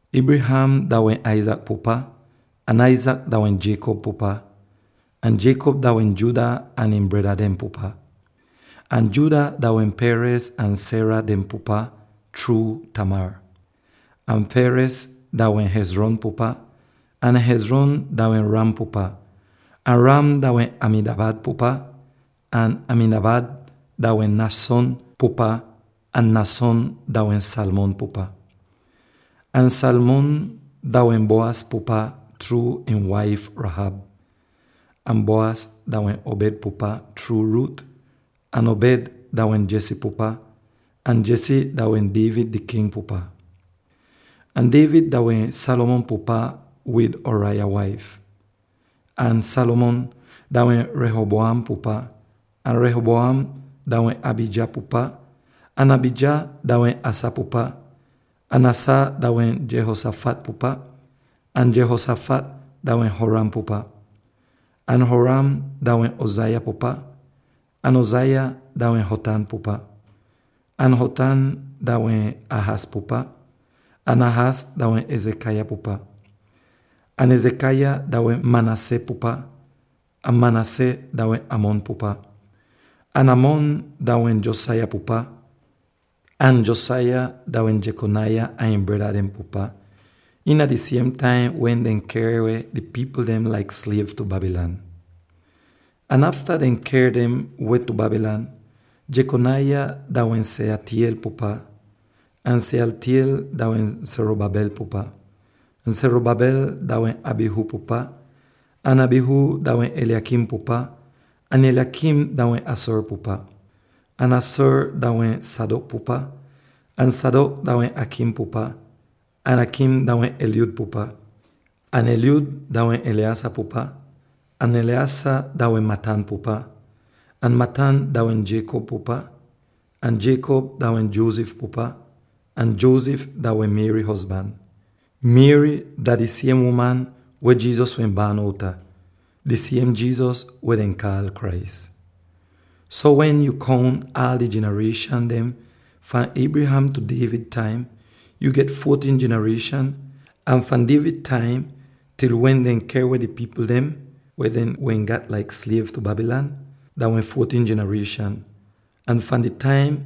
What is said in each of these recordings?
Abraham dah wehn Isaac pupa, ahn Isaac dah wehn Jacob pupa, ahn Jacob dah wehn Judah ahn ihn breda dehn pupa, ahn Judah dah wehn Perez ahn Zerah dehn pupa chruu Tamar, ahn Perez dah wehn Hezron pupa, ahn Hezron dah wehn Ram pupa, ahn Ram dah wehn Amminadab pupa, ahn Amminadab dah wehn Nahshon pupa, ahn Nahshon dah wehn Salmon pupa, ahn Salmon dah wehn Boaz pupa chruu ihn waif Rahab, ahn Boaz dah wehn Obed pupa chruu Ruth, ahn Obed dah wehn Jesse pupa, ahn Jesse dah wehn David di King pupa. Ahn David dah wehn Solomon pupa wid Uriah waif, ahn Solomon dah wehn Rehoboam pupa, ahn Rehoboam dah wehn Abijah pupa, ahn Abijah dah wehn Asa pupa, ahn Asa dah wehn Jehoshaphat pupa, ahn Jehoshaphat dah wehn Joram pupa, ahn Joram dah wehn Uzziah pupa, ahn Uzziah dah wehn Jotham pupa, ahn Jotham dah wehn Ahaz pupa, ahn Ahaz dah wehn Hezekiah pupa, ahn Hezekiah dah wehn Manasseh pupa, ahn Manasseh dah wehn Amon pupa, ahn Amon dah wehn Josiah pupa, ahn Josiah dah wehn Jechoniah ahn ihn breda dehn pupa, iina di siem taim wen dehn ker weh di pipl dem laik sliev tu Babylon. Ahn afta dehn ker dem weh tu Babylon, Jechoniah dah wehn Shealtiel pupa, ahn Shealtiel dah wehn Zerubbabel pupa, ahn Zerubbabel dah wehn Abihud pupa, ahn Abihud dah wehn Eliakim pupa, ahn Eliakim dah wehn Azor pupa, ahn Azor dah wehn Zadok pupa, ahn Zadok dah wehn Achim pupa, ahn Achim dah wehn Eliud pupa, ahn Eliud dah wehn Eleazar pupa, ahn Eleazar dah wehn Matthan pupa, ahn Matthan dah wehn Jacob pupa, ahn Jacob dah wehn Joseph pupa, ahn Joseph dah wehn Mary hozban. Mary dah di siem uman weh Jesus wehn baan outa, di siem Jesus weh dehn kaal “Christ.” So wen yo kount aal di jinarieshan dem fahn Abraham tu David taim, yo get fourteen jinarieshan, ahn fahn David taim til wen dehn ker weh di pipl dem —weh dehn wehn gat laik sliev tu Babylon— dah wehn fourteen jinarieshan tu, ahn fahn di taim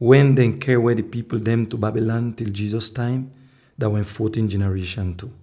wen dehn ker weh di pipl dem tu Babylon til Jesus taim, dah wehn fourteen jinarieshan tu.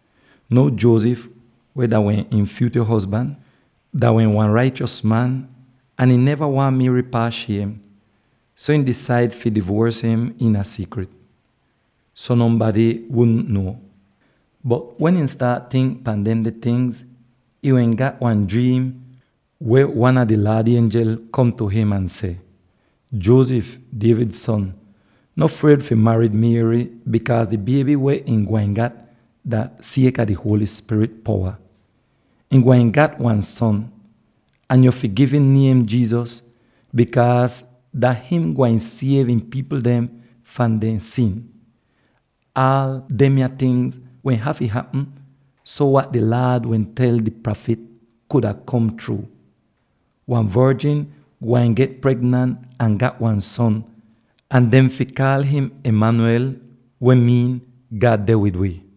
Now Joseph —weh dah wehn ihn fyutyo hozban— dah wehn wan raichos man ahn ihn neva waahn Mary paas shiem, so ihn disaid fi divuors im iina siikrit, so nonbady wudn nuo. Bot wehn ihn staat tink pan demde tingz, ihn wehn gat wan driim weh wan a di Laad ienjel kom tu him ahn seh, “Joseph, David son, no fried fi marid Mary, bikaaz di bieby weh ihn gwain gat dah sieka di Holy Spirit powa. Ihn gwain gat wan son, ahn yo fi gi'im niem ‘Jesus’ bikaaz dah him gwain siev ihn pipl dem fahn dehn sin.” Aal demya tingz wehn hafy hapm, so wat di Laad wehn tel di prafit kuda kom chruu: “Wan vorjin gwain get pregnant ahn gat wan son, ahn dehn fi kaal im Immanuel, weh miin, ‘God deh wid wi.’”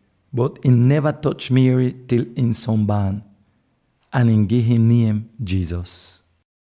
bot ihn neva toch Mary til ihn son baan. Ahn ihn gi'im niem “Jesus.”